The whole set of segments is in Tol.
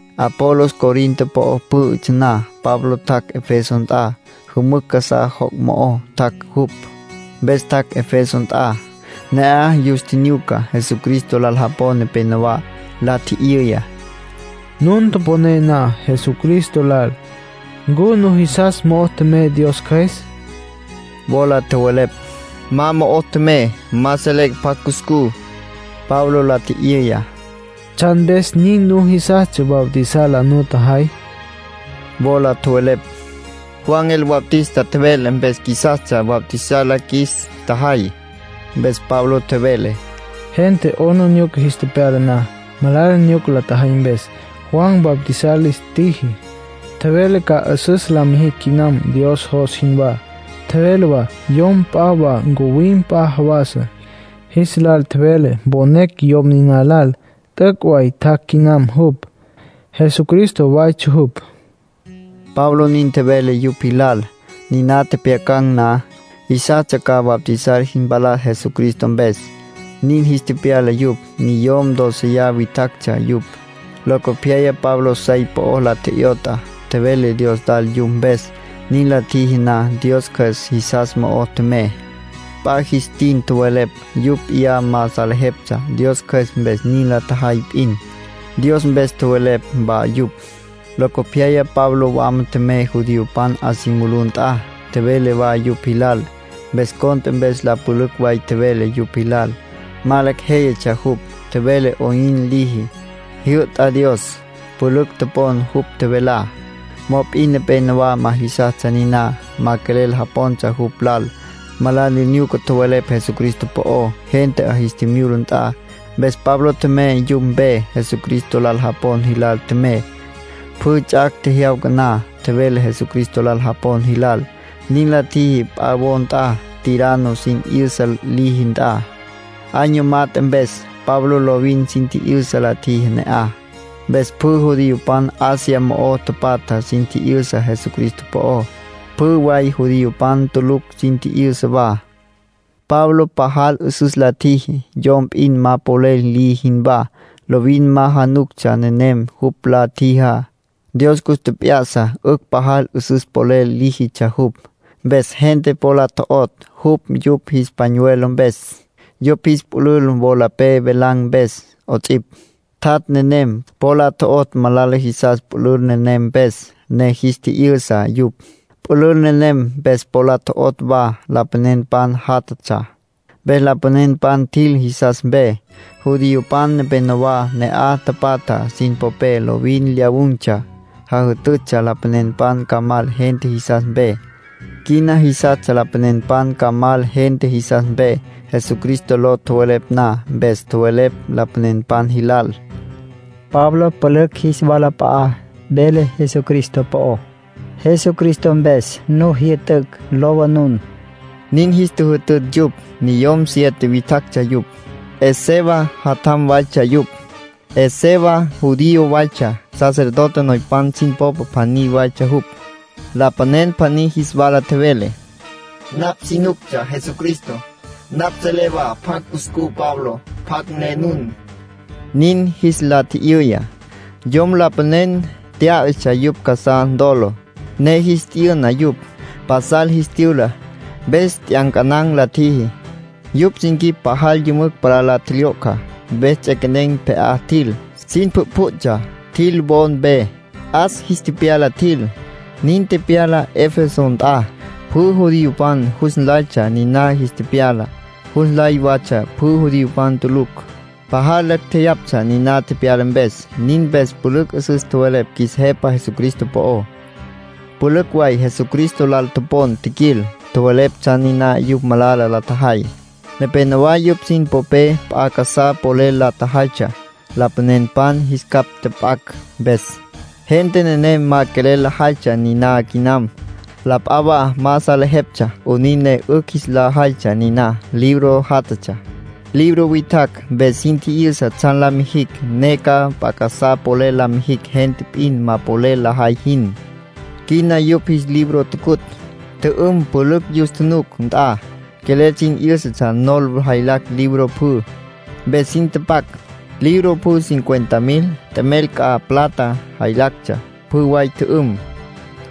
Apolos Corinto po'o pǘ'ütsja na, Pablo tjac' Efeso nt'a. Jümücj casá joc' mo'o tjac' jupj, mpes tjac' Efeso nt'a. Ne'aj yus tjinyuca Jesucristo lal japon nepenowá. La tji'yüya: —Nun toponé na Jesucristo lal, ¿ncu nujisas mo'o tjemey Dios Cjües? Wola tjowelepj: —Ma mo'o tjemey. Ma selecj pjacj cuscú. Pablo la tji'yüya: —¿Tsjan mpes nin nujisastsja bautizar la nutjajay? Wola tjowelepj: —Juan el Bautista tjevele mpes qjuisastsja bautizar la qjuis tjajay. Mpes Pablo tjevele: —Gente 'aplijila jis tepyala na, malala nyuca la tjajay mpes, Juan bautizar lis tjiji. Tjevele ca 'üsüs la mijicj quinam Dios jos jinwá. Tjevele wa yom p'a wa ncuwim p'a jawas. Jis lal tjevele mponecj yom niná lal. T'üc' way tjac' quinam jupj. Jesucristo waytsja jupj —Pablo nin tjevele yupj jilal. Niná tjepjyacan̈ na, jisastsja ca bautizar jis mpalas Jesucristo mpes. Nin jis tepyala yupj. Niyom dóceya witjactsja yupj. Locopyaya Pablo sey po la tje'yot'a, tjevele Dios lal yupj mpes. Nin la tjiji na, Dios Cjües jisas mo'o tjemey. P'a jis tin tjowelepj, yupj p'iyá ma salejeptsja. Dios Cjües mpes nin la tjajay p'in. Dios mpes tjowelepj wa yupj. Locopyaya Pablo wama tjemey judiopan 'a si mulú nt'a, tjevele wa yupj jilal. Mes cont'e mpes la pülücj way tjevele yupj jilal. Ma lecj jéyatsja jupj. Tjevele 'oyn liji, jyü'ta Dios. Pülücj topon jupj tjevelá. Mop'in nepénowa ma jisastsja niná. Ma quelel japontsja jupj lal. Malala nyuca tjowelepj Jesucristo po'ó, gente 'a jis tjimyula nt'a. Mpes Pablo tjemey yupj mpe, Jesucristo lal japon jilal tjemey. Pjü ts'ac' tjejyawca na, tjevele Jesucristo lal japon jilal. Nin la tjiji p'a wo nt'a, Tirano sin 'yüsa liji nt'a. Año mat'e mpes, Pablo lovin sin tji'yüsa la tjiji ne'aj. Mpes pjü judiopan Asia mo'o tapatja sin tji'yüsa Jesucristo po'ó. Pjü way judiopan tulucj sin tji'yüsa wa. Pablo pajal 'üsüs la tjiji, yom p'in ma polel liji jinwá. Lovin ma januctsja nenem jupj la tjijá. Dios cus tjep'ya'sa 'ücj pajal 'üsüs polel líjitsja jupj. Mpes gente po la tjo'otj jupj yupj jis pañuelo mpes, yupj jis pülül wolapé velan̈ mpes 'ots'ipj. Tjat' nenem, po la tjo'otj malala jisas pülül nenem mpes, ne jis tji'yü'sa yupj. Pülül nenem mpes po la tjo'otj wa lapanenpan jatatsja, mpes lapanenpan tjil jisas mpe. Judiopan nepenowá ne'aj tapatja sin popé lovin lyawun̈tsja, jajütütsja lapanenpan ca mal gente jisas mpe. Quina jisastsja lapanenpan ca mal gente jisas mpe, Jesucristo ló tjowelepj na. Mpes tjowelepj lapanenpan jilal: “Pablo pülücj jis walap'a'a vele Jesucristo po'ó. Jesucristo mpes nu jyü'tücj lowa nun”, nin jis tjüjütütj yupj. Niyom siete witjactsja yupj. Esceva jatjampan waytsja yupj. Esceva judío waytsja. Sacerdote noypan sin popa pjaní waytsja jupj. Lapanen pjaní jis wala tjevele: “Napj si nuctsja Jesucristo. Napj selé wa pjacj cuscú Pabló. ¿Pjacj ne nun?” nin jis la tji'yüya. Yom lapanen tyá'atsja, yupj casá ntolo, ne jis tyü'na yupj. Pasal jis tyüla, mpes t'yancanan̈ la tjiji. Yupj sin quip pajal yümücj palá la tjelyo'cja. Mpes ts'equenen̈ pje'á tjil, sin pjütpjütsja tjil wo mpe. 'As jis tepyala tjil. Nin tepyala Efeso nt'a. Pjü judiopan jus nlaytsja niná jis tepyalá, jus nlay watsja pjü judiopan tulucj. Pajal lacj jeyaptsja niná tepyala mpes. Nin mpes pülücj 'üsüs tjowelepj qjuis Jepa Jesucristo po'ó. Pülücj way Jesucristo lal topon tjiquil, tjowelepj tsjan niná yupj malala la tjajay. Nepénowa yupj sin popé p'a casá polel la tjajaytsja, lapanenpan jis capj tjap'acj mpes. Gente nenem ma quelel lajaytsja niná quinam. La p'a wa ma salejeptsja 'onin ne 'ücj jis la jaytsja niná. Libro jatatsja. Libro witjacj mpes sin tji'yüsa tsjan la mijicj ne ca p'a casá polel la mijicj gente p'in ma polel lajay jin. Quina yupj jis libro tucutj, tjü'üm pülücj yus tjunuc nt'a. Quelel sin 'yǘsatsja nol jaylacj libro pjü, mpes sin tapac. Libro pjü cincuenta mil t'emel c'a plata jaylactsja. Pjü way tjü'üm.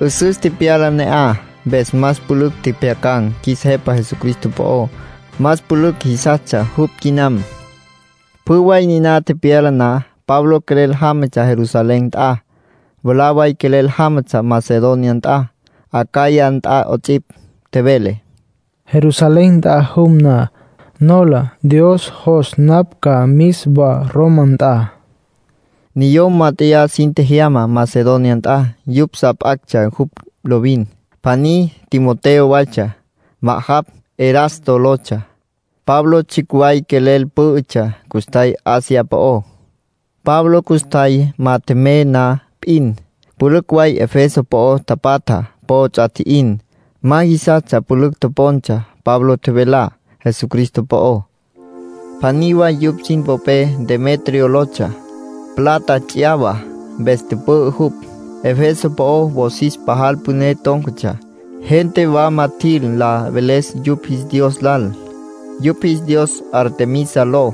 'Üsüs tepyala ne'aj, mpes más pülücj tjepjyacan̈ qjuis Jepa Jesucristo po'ó, más pülücj jisastsja jupj quinam. Pjü way niná tepyala na, Pablo quelel jámatsja Jerusalén nt'a. Mwalá way quelel jámatsja Macedonia nt'a, Acaya nt'a 'ots'ipj. Tjevele: “Jerusalén nt'a tjum na, nola Dios jos napj ca mis wa Roma nt'a”, nin tjevele. Niyom mát'eya sin tjejyama Macedonia nt'a, yupj sa p'actsja jupj lovin. Pjaní Timoteo waytsja. Ma'ajapj Erasto lotsja. Pablo tsjicj way quelel pǘ'ütsja custjay Asia po'ó. Pablo custjay ma tjemey na p'in, pülücj way Efeso po'o tapatja po ts'a tji'in. Ma jisastsja pülücj topontsja Pablo tjevelá Jesucristo po'ó. Pjaní way yupj sin popé Demetrio lotsja. Plata ts'yawa mpes tüpü'ü jupj. Efeso po'ó wosis pajal püné tón̈catsja, gente wama tjil la veles yupj jis dios lal, yupj jis dios Artemisa ló.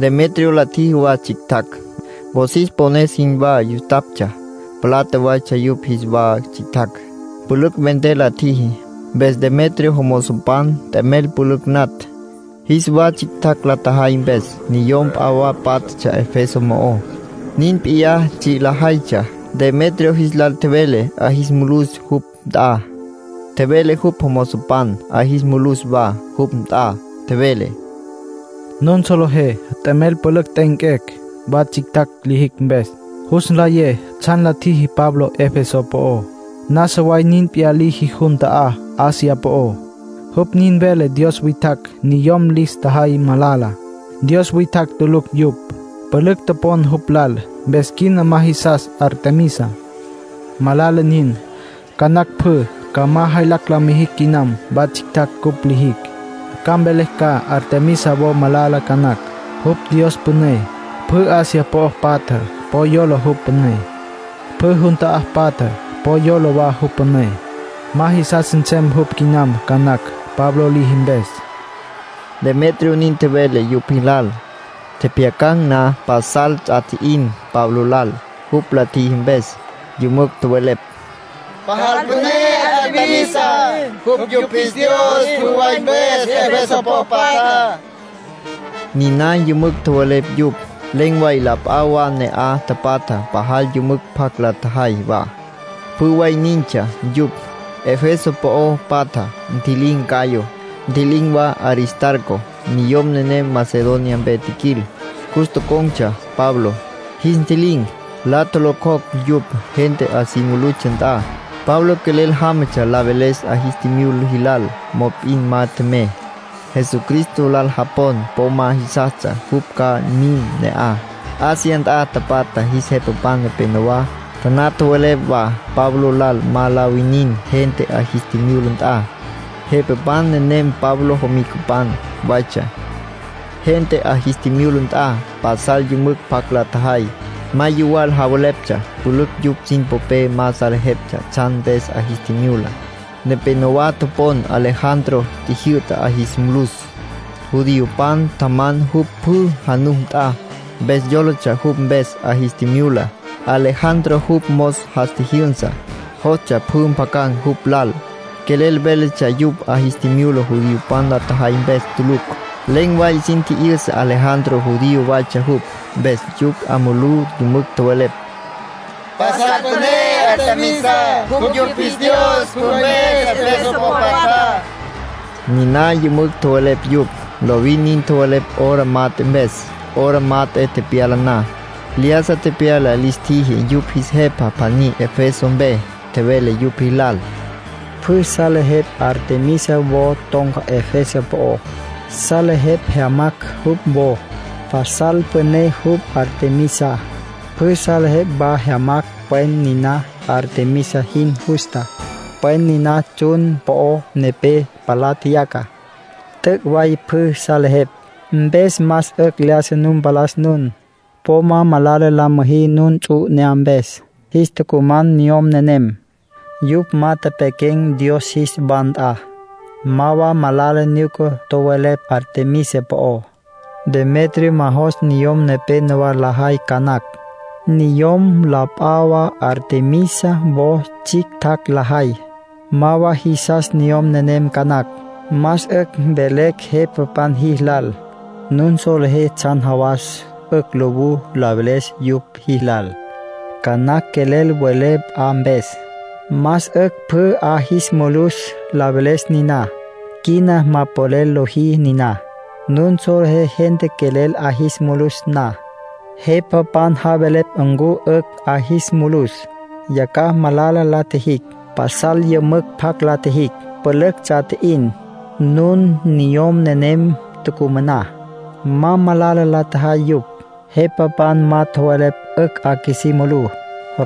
Demetrio la tjiji wa tsjictjacj, wosis pones jinwá yustaptsja. Plata waytsja yupj jis wa tsjictjacj. Pülücj vender la tjiji. Mpes Demetrio jomozopan t'emel pülücj natj, jis wa tsjictjacj la tjajay mpes. Niyom p'a wa pátjatsja Efeso mo'ó, nin p'iyá tsji' lajaytsja. Demetrio jis lal tjevele 'a jis mulus jupj nt'a. Tjevele jupj jomozopan 'a jis mulus wa jupj nt'a. Tjevele: —Nun solejé t'emel pülücj t'e'enquecj, wa tsjictjacj lijicj mpes. Jus nlayé tsjan la tjiji Pablo Efeso po'ó, nasa way nin p'iyá liji jun ta'á Asia po'ó. Jupj nin vele dios witjacj niyom lis tjajay malala, dios witjacj tulucj yupj. Pülücj topon jupj lal, mpes quina ma jisas Artemisa. Malala nin. Ca nacj pjü ca ma jaylacj la mijicj quinam wa tsjictjacj cupj lijicj. Ca mvelecj ca Artemisa wo malala ca nacj. Jupj dios püné. Pjü Asia po'o patja po yola jupj püné. Pjü jun ta'á patja po yola wa jupj püné. Ma jisas nsem jupj quinam ca nacj, Pablo liji mpes —Demetrio nin tjevele yupj jilal. Tjepjyacan̈ na pasal ts'a tji'in Pablo lal, jupj la tjiji mpes. Yümücj tjowelepj: —Pajal püné Artemisa. Jupj yupj jis dios pjü way mpes Efeso po'o patjá —niná yümücj tjowelepj yupj. Len̈ way la p'a wa ne'aj tapatja pajal yümücj pjac la tjajay wa. Pjü way nintsja yupj, Efeso po'o patjá. Ntji'lin̈ Gayo, ntji'lin̈ wa Aristarco. Niyom nenem Macedonia mpe tjiquil. Cus tocon̈tsja Pablo. Jis ntji'lin̈, la tjolocjocj yupj gente 'a si mulutsja nt'a. Pablo quelel jámatsja la veles 'a jis tjimyula jilal. Mop'in ma tjemey. Jesucristo lal japon po ma jisastsja jupj ca mim ne'aj. Asia nt'a tapatja jis jepapan nepenowá taná tjowelepj wa Pablo lal ma la winin gente 'a jis tjimyula nt'a. Jepapan nenem Pablo jomicapan waytsja. Gente 'a jis tjimyula nt'a, pasal yümücj pjac la tjajay. Ma yuwal javeleptsja. Pülücj yupj sin popé ma salejeptsja tsjan mpes 'a jis tjimyula. Nepénowa topon Alejandro tjijyü'ta 'a jis mulus. Judiopan tjaman jupj pjü januc nt'a, mpes yólatsja jupj mpes 'a jis tjimyula. Alejandro jupj mos jas tjijyünsa, jostsja pjü mpjacan̈ jupj lal. Quelel véletsja yupj 'a jis tjimyula judiopan la tjajay mpes tulucj. Len̈ way sin tji'yüsa Alejandro judío waytsja jupj, mpes yupj 'a mulú yümücj tjowelepj: —Pasal püné Artemisa. Jupj yupj jis dios pjü mpes Efeso po'o patjá —niná yümücj tjowelepj yupj. Lovin nin tjowelepj hora mat'e mpes. Hora mat'e tepyala na, lyájasa tepyala lis tjiji yupj jis jepa pjaní Efeso mpe. Tjevele yupj jilal: —Pjü salejepj Artemisa wo ton̈ca Efeso po'ó. Salejepj jyamacj jupj wo. Pasal püné jupj, Artemisa. Pjü salejepj wa jyamacj pwen niná Artemisa jin justa, pwen niná tsjun po'o nepé palá tjeyaca. T'üc' way pjü salejepj. Mpes más 'ücj lyájasa nu mpalas nun. Po ma malala la müjí nun ts'u 'inyá mpes. Jis tucuman niyom nenem. Yupj ma tepequen̈ dios jis wa nt'a. Ma wa malala nyuca tjowelepj Artemisa po'ó. Demetrio ma jos niyom nepenowá lajay ca nacj. Niyom la p'a wa Artemisa wo tsjictjacj lajay, ma wa jisas niyom nenem ca nacj. Más 'ücj mvelecj jepapan jilal. Nun solejé tsjan jawas 'ücj lowú la veles yupj jilal. Ca nacj quelel welé p'a mpes. Más 'ücj pjü 'a jis mulus la veles niná. Quina ma polel lojí niná. Nun solejé gente quelel 'a jis mulus na, jepapan javelepj ncu 'ücj 'a jis mulus. Yacjaj malala la tjijicj. Pasal yümücj pjac la tjijicj, pülücj ts'a tji'in. Nun niyom nenem tucumaná, ma malala la tjajay yupj. Jepapan ma tjowelepj 'ücj 'a qjuisí mulú.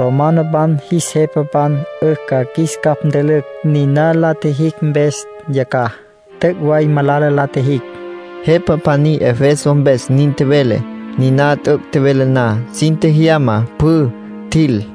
Romanopan jis jepapan 'ücj ca qjuis capj ntülücj niná la tjijicj mpes yacjaj. T'üc' way malala la tjijicj —jepa pjaní Efeso mpes nin tjevele. Niná t'üc' tjevele na, sin tjejyama pjü, tjil.